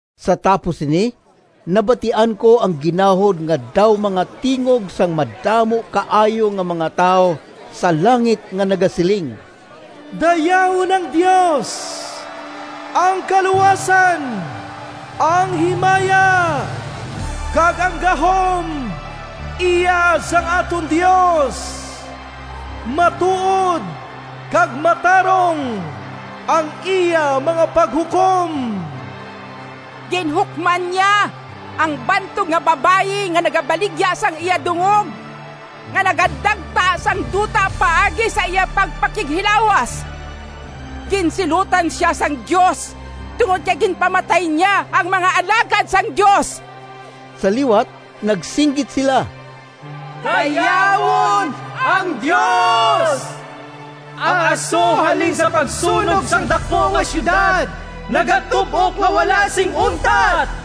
Sa tapos sini nabatian ko ang ginahod nga daw mga tingog sang madamo kaayo nga mga tawo sa langit nga nagasiling, “Dayawon ang Dios! Ang kaluwasan, ang himaya, kag ang gahom iya sang aton Dios! Matuod kag matarong ang iya mga paghukom! Ginhukman niya ang bantog nga babayi nga nagabaligya sang iya dungog, nga nagadagta sang duta paagi sa iya pagpakighilawas. Ginsilutan sia sang Dios tungod kay ginpamatay niya ang mga alagad sang Dios.” Sa liwat nagsinggit sila, “Dayawon ang Dios! Ang aso halin sa pagsunog sang daku nga siyudad nagatub-ok nga wala sing untat!”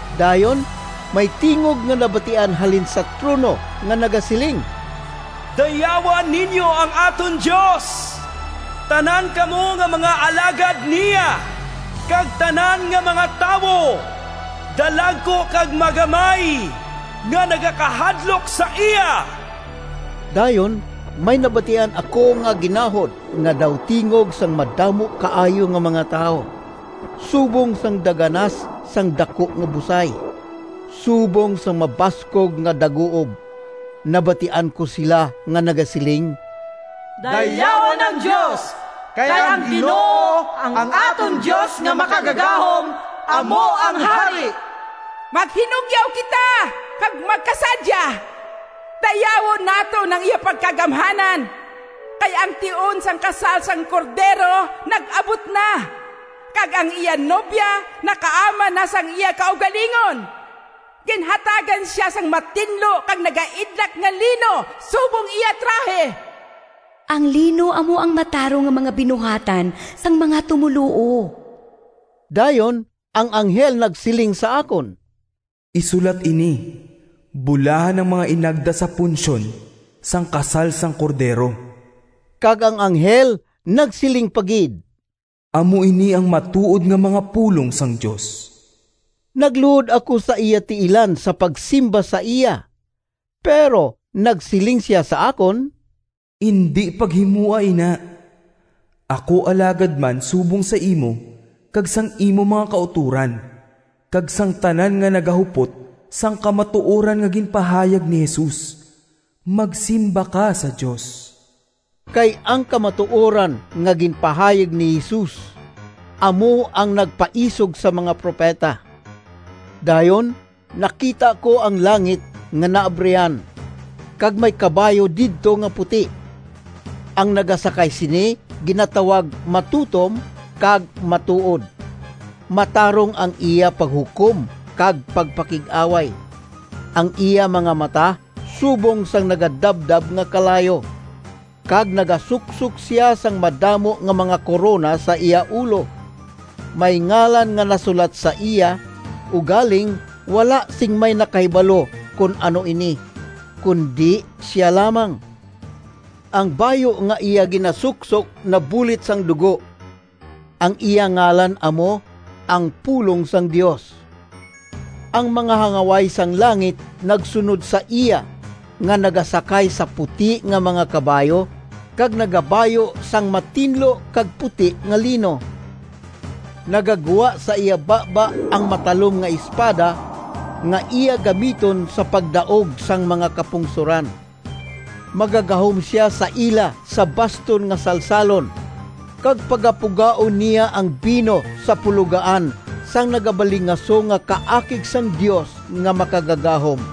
Dayon may tingog nga nabatian halin sa trono nga nagasiling, “Dayawa ninyo ang aton Dios, tanan kamo nga mga alagad niya, kag tanan nga mga tawo, dalagku kag magamay, nga nagakahadlok sa iya!” Dayon may nabatian ako nga ginahod nga daw tingog sang madamo kaayo nga mga tawo, subong sang daganas sang daku nga busay, subong sang mabaskog nga daguob. Nabatian ko sila nga nagasiling, “Dayawon ang Dios! Kay ang Ginoo, ang aton Dios nga Makagagahom, amo ang Hari! Maghinugyaw kita kag magkasadya, dayawon naton ang iya pagkagamhanan! Kay ang tion sang kasal sang Cordero nag-abot na, kag ang iya nobya nakaaman na sang iya kaugalingon. Ginhatagan sia sang matinlo kag nagaidlak nga lino subong iya trahe.” (Ang lino amo ang matarong nga mga binuhatan sang mga tumoluo.) Dayon ang anghel nagsiling sa akon, “Isulat ini: Bulahan ang mga inagda sa punsyon sang kasal sang Cordero.” Kag ang anghel nagsiling pa gid, “Amo ini ang matuod nga mga pulong sang Dios.” Nagluhod ako sa iya tiilan sa pagsimba sa iya, pero nagsiling sia sa akon, “Indi paghimoa ina! Ako alagad man subong sa imo kag sang imo mga kautoran, kag sang tanan nga nagahupot sang kamatuoran nga ginpahayag ni Jesus. Magsimba ka sa Dios!” Kay ang kamatuoran nga ginpahayag ni Jesus amo ang nagpaisog sa mga propeta. Dayon nakita ko ang langit nga naabrihan, kag may kabayo didto nga puti. Ang nagasakay sini ginatawag Matutom kag Matuod. Matarong ang iya paghukom kag pagpakig-away. Ang iya mga mata subong sang nagadabdab nga kalayo, kag nagasuksok sia sang madamo nga mga korona sa iya ulo. May ngalan nga nasulat sa iya, ugaling wala sing may nakahibalo kon ano ini, kundi sia lamang. Ang bayu nga iya ginasuksok nabulit sang dugo. Ang iya ngalan amo, “Ang Pulong sang Dios.” Ang mga hangaway sang langit nagsunod sa iya nga nagasakay sa puti nga mga kabayo kag nagabayu sang matinlo kag puti nga lino. Nagagwa sa iya baba ang matalom nga espada nga iya gamiton sa pagdaog sang mga kapungsoran. Magagahom sia sa ila sa baston nga salsalon, kag pagapugaon niya ang bino sa pulogaan sang nagabalingaso nga kaakig sang Dios nga Makagagahom.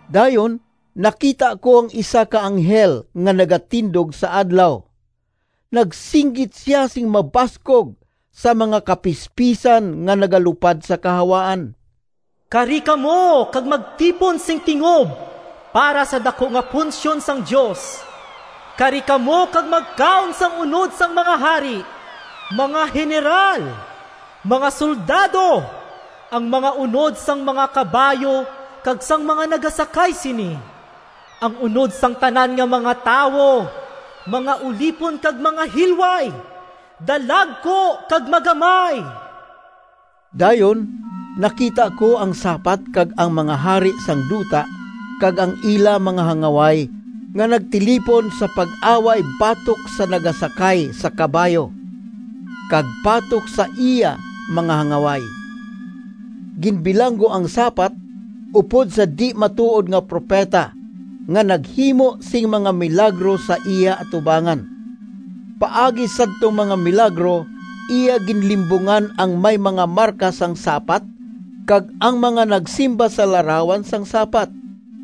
Dayon nakita ko ang isa ka anghel nga nagatindog sa adlaw. Nagsinggit sia sing mabaskog sa mga kapispisan nga nagalupad sa kahawaan, “Kari kamo kag magtipon sing tingob para sa daku nga punsyon sang Dios! Kari kamo kag magkaon sang unod sang mga hari, mga heneral, mga soldado, ang mga unod sang mga kabayo kag sang mga nagasakay sini, ang unod sang tanan nga mga tawo, mga ulipon kag mga hilway, dalagku kag magamay!” Dayon nakita ko ang sapat kag ang mga hari sang duta kag ang ila mga hangaway nga nagtilipon sa pag-away batok sa nagasakay sa kabayo, kag batok sa iya mga hangaway. Ginbilanggo ang sapat upod sa di-matuod nga propeta nga naghimo sing mga milagro sa iya atubangan. (Paagi sadtong mga milagro, iya ginlimbungan ang may mga marka sang sapat, kag ang mga nagsimba sa larawan sang sapat.)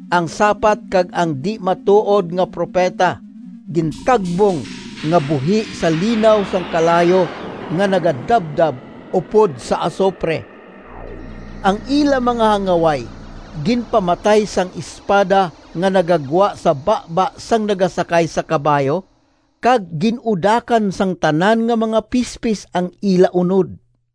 Ang sapat kag ang di-matuod nga propeta gintagbong nga buhi sa linaw sang kalayo nga nagadabdab upod sa asupre. Ang ila mga hangaway ginpamatay sang espada nga nagagwa sa baba sang nagasakay sa kabayo, kag gin-udakan sang tanan nga mga pispis ang ila unod.